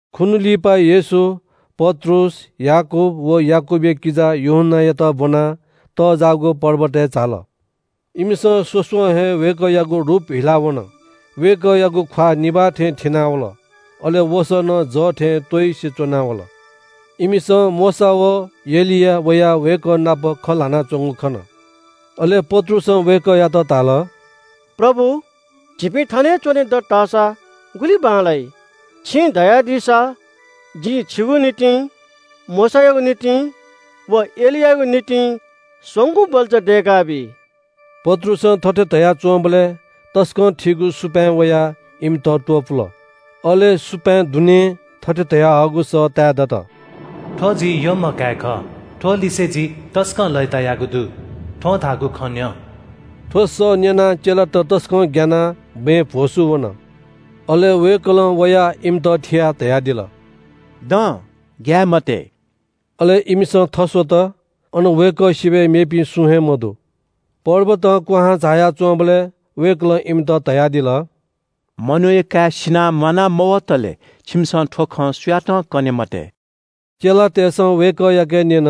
खुन्‍हु लिपा येशू पत्रुस, याकूब व याकूबया किजा यूहन्‍नायात ब्‍वनाः तज्‍जाःगु पर्वतय् झाल। इमिसं स्‍वस्‍वं हे वय्‌कःयागु रूप हिला वन। वय्‌कःयागु ख्‍वाः निभाः थें थिनावल, अले वसः नं जः थें त्‍वइसे च्‍वना वल। इमिसं मोशा व एलिया वयाः वय्‌कः नाप खँ ल्‍हानाच्‍वंगु खन। अले पत्रुसं वय्‌कःयात धाल – “प्रभु, झीपिं थन हे च्‍वने दत धाःसा गुलि बांलाइ। छिं धयादीसा जिं छिगु निंतिं, मोशायागु निंतिं व एलियायागु निंतिं स्‍वंगू बल्‍चा दय्‌काबी।” पत्रुसं थथे धयाच्‍वंबलय् तसकं थीगु सुपाँय् वयाः इमित त्‍वपुल। अले सुपाँय् दुनें थथे धयाहःगु सः ताये दत – “थ्‍व जि यःम्‍ह काय् खः। थ्‍व लिसे जि तसकं लय्‌तायागु दु। थ्‍वं धाःगु खँ न्‍यँ।” थ्‍व सः न्‍यनाः चेलात तसकं ग्‍यानाः बँय् भ्‍वसू वन। अले वय्‌कलं वयाः इमित थियाः धयादिल – “दँ, ग्‍याये मते।” अले इमिसं थस्‍वत, अन वय्‌कः सिबय् मेपिं सुं हे मदु। पर्वतं क्‍वहां झाया च्‍वंबलय् वय्‌कलं इमित धयादिल – “मनूया काय् सिनाः म्‍वाना मवतले छिमिसं थ्‍व खँ सुयातं कने मते।” चेलातय्‌सं वय्‌कःयाके न्‍यन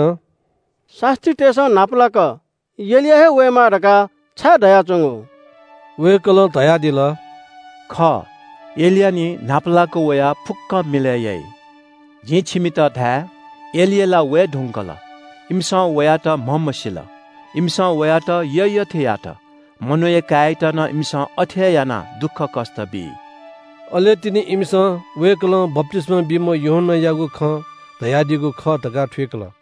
– “शास्‍त्रीतय्‌सं न्‍हापालाक एलिया हे वयेमाः धकाः छाय् धयाच्‍वंगु?” वय्‌कलं धयादिल – “खः, एलिया निं न्‍हापालाक वयाः फुक्‍कं मिलय् याइ। जिं छिमित धाये – एलिया ला वये धुंकल। इमिसं वयात म्‍हमसील। इमिसं वयात यःयःथें यात। मनूया काय्‌यात नं इमिसं अथे हे यानाः दुःखकष्‍ट बी।” अले तिनि इमिसं वय्‌कलं बप्‍तिस्‍मा बीम्‍ह यूहन्‍नायागु खँ धयादीगु खः धकाः थुइकल।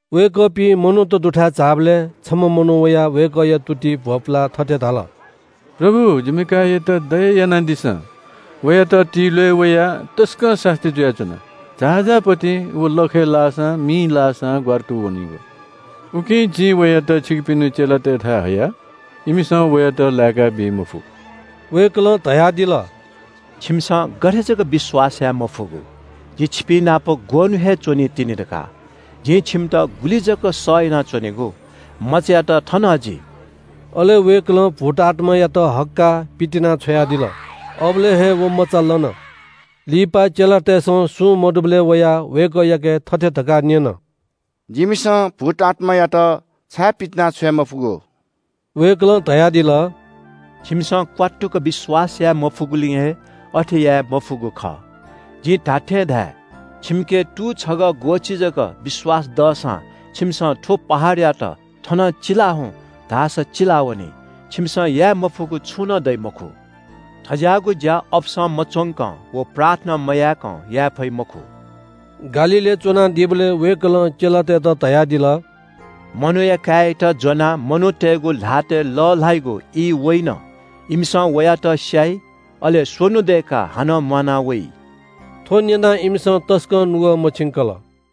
वय्‌कःपिं मनूत दुथाय् झाःबलय् छम्‍ह मनू वयाः वय्‌कःया तुतिइ भ्‍वपुलाः थथे धाल – “प्रभु, जिमि काय्‌यात दया यानादिसँ। वयात तिल्‍वय् वयाः तसकं सास्‍ती जुयाच्‍वन। झाःझाः पतिं व लखय् लाःसां मिइ लाःसां ग्‍वारातू वनीगु। उकिं जिं वयात छिकपिनि चेलातय्‌थाय् हया। इमिसं वयात लाय्‌काबी मफु।” वय्‌कलं धयादिल – “छिमिसं गथे जक विश्‍वास याये मफुगु? जि छिपिंनाप ग्‍वःन्‍हु हे च्‍वनीतिनि धकाः? जिं छिमित गुलि जक सह यानाच्‍वनेगु? मचायात थन हजि।” अले वय्‌कलं भूतआत्‍मायात हक्‍काः पितिनाछ्वयादिल। अबलय् हे व मचा लन। लिपा चेलातय्‌सं सुं मदुबलय् वयाः वय्‌कःयाके थथे धकाः न्‍यन – “जिमिसं भूतआत्‍मायात छाय् पितिनाछ्वये मफुगु?” वय्‌कलं धयादिल – “छिमिसं क्‍वात्तुक विश्‍वास याये मफुगुलिं अथे याये मफुगु खः। जिं धात्‍थें धाये – छिमिके तू छगः ग्‍वःछि जक विश्‍वास दःसां छिमिसं थ्‍व पहाडयात ‘थनं चिला हुँ’ धाःसा चिलावनी। छिमिसं याये मफुगु छुं नं दइ मखु। थज्‍याःगु ज्‍या अपसं मच्‍वंकं व प्रार्थना मयाय्‌कं याये फइ मखु।” गालीलय् च्‍वनादीबलय् वय्‌कलं चेलातय्‌त धयादिल – “मनूया काय्‌यात ज्‍वनाः मनूतय्‌गु ल्‍हातय् लःल्‍हाइगु ई वइन। इमिसं वयात स्‍याइ, अले स्‍वन्‍हु दय्‌काः हानं म्‍वाना वइ।” थ्‍व न्‍यनाः इमिसं तसकं नुगः मछिंकल।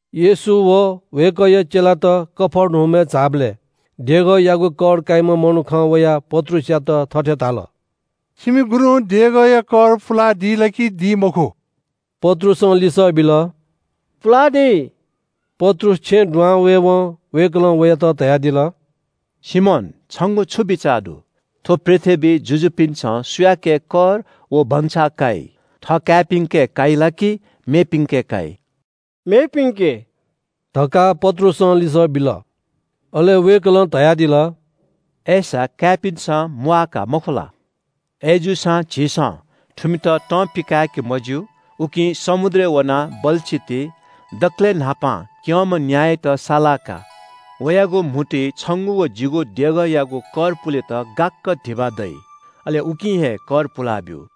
येशू व वय्‌कःया चेलात कफर्नहुमय् झाःबलय् देगःयागु कर काइम्‍ह मनुखं वयाः पत्रुसयात थथे धाल – “छिमि गुरुं देगःयागु कर पुलादी ला कि दी मखु?” पत्रुसं लिसः बिल – “पुलादी।” पत्रुस छेँय् दुहां वयेवं वय्‌कलं वयात धयादिल – “सिमोन, छंगु छु बिचाः दु? थ्‍व पृथ्‍वीइ जुजुपिन्‍सं सुयाके कर व भंसाः काइ? थः काय्‌पिन्‍के काइ ला कि मेपिन्‍के काइ?” “मेपिन्‍के” धकाः पत्रुसं लिसः बिल। अले वय्‌कलं धयादिल – “अय्‌सा काय्‌पिन्‍सं म्‍वाः का मखु ला? अय्‌जूसां झीसं थुमित तं पिकाय्‌के मज्‍यू, उकिं समुद्रय् वनाः बल्‍छी ति। दकलय् न्‍हापां क्‍यंम्‍ह न्‍यायात सालाः का। वयागु म्‍हुतुइ छंगु व जिगु देगःयागु कर पुलेत गाक्‍क धिबा दइ। अले उकिं हे कर पुलाब्‍यु।”